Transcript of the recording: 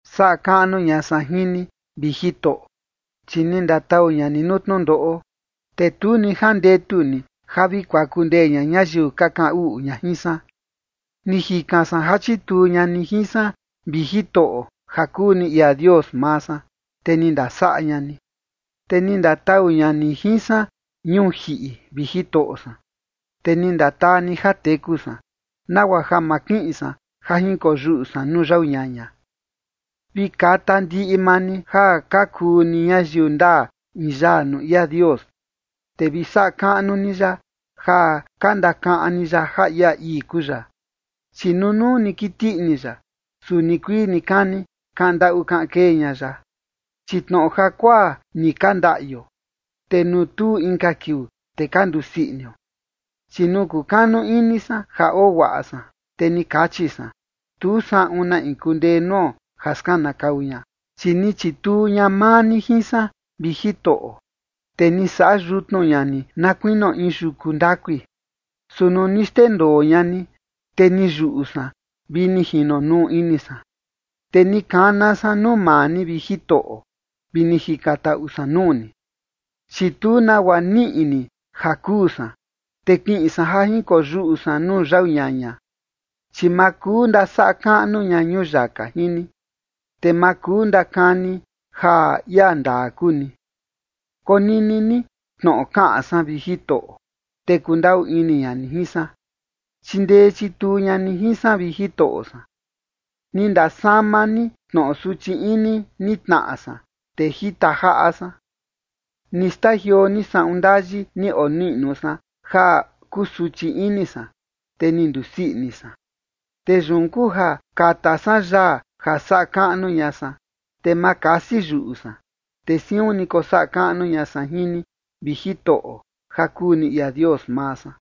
Saꞌa kaꞌnu ña san jin ni, vi Jitoꞌo, chi ni ndatau ña ni nuu tnundoꞌo, te tu ni jandetu ni ja vi kuaku ndee ña ñayiu ka kaꞌan uꞌu ña jin san. Ni jikan san ja chituu ña ni jin san, vi Jitoꞌo, ja kuu ni ia Dios maa san, te ni ndasaꞌa ña ni. Te ni ndatau ña ni jin san ñuu jiꞌi, vi Jitoꞌo san, te ni ndataa ni ja teku san, nagua ja ma kiꞌin san ja jinkoyuꞌu san nuu yau ñaña. Vi kata ndiꞌi maa ni ja ka kuu ni ñayiu ndaa in yaa nuu ia Dios, te vi saꞌa kaꞌnu ni ya ja ka ndakaꞌan ni ya ja ia ii kuu ya. Chi nunuu ni kiti ini ya, su nikuii nikani kaꞌan ndaꞌu kaꞌan kee ña ya, chi tnoꞌo jakuaa ni ka ndaꞌio, te nuu tuu inka kiuu, te ka ndusii inio. Chi nuu kukanu ini san ja oo guaꞌa san, te ni kachi san: “Tu saꞌun na in kundee nuo ja skanakau ña”. Chi ni chituu ña maa ni jin san, vi Jitoꞌo, te ni saꞌa yutnu ña ni na kuinio in yuku ndakui, su nuu ni xndendoo ña ni, te ni yuꞌu san vi ni jinonuu ini san. Te ni kana san nuu maa ni, vi Jitoꞌo, vi ni jikantaꞌu san nuu ni. Chi tu nagua niꞌi ni ja kuu san, te kiꞌin san ja jinkoyuꞌu san nuu yau ñaña, chi ma kuu ndasaꞌa kaꞌnu ña ñuyaka jin ni, te ma kuu ndakani ja ia ndaa kuu ni. Konini ni tnoꞌo kaꞌan san, vi Jitoꞌo, te kundaꞌu ini ña ni jin san. Chindee chituu ña ni jin san, vi Jitoꞌo san. Ni ndasama ni tnoꞌo suchi ini ni tnaꞌa san, te jita jaꞌa san. Ni xtajioo ni saꞌun ndayi ni oniꞌnu san ja kusuchi ini san, te ni ndusii ini san. Te yun kuu ja kata san yaa ja saꞌa kaꞌnu ña san, te ma kasi yuꞌu san. Te siun ni kosaꞌa kaꞌnu ña san jin ni, vi Jitoꞌo ja kuu ni ia Dios maa san.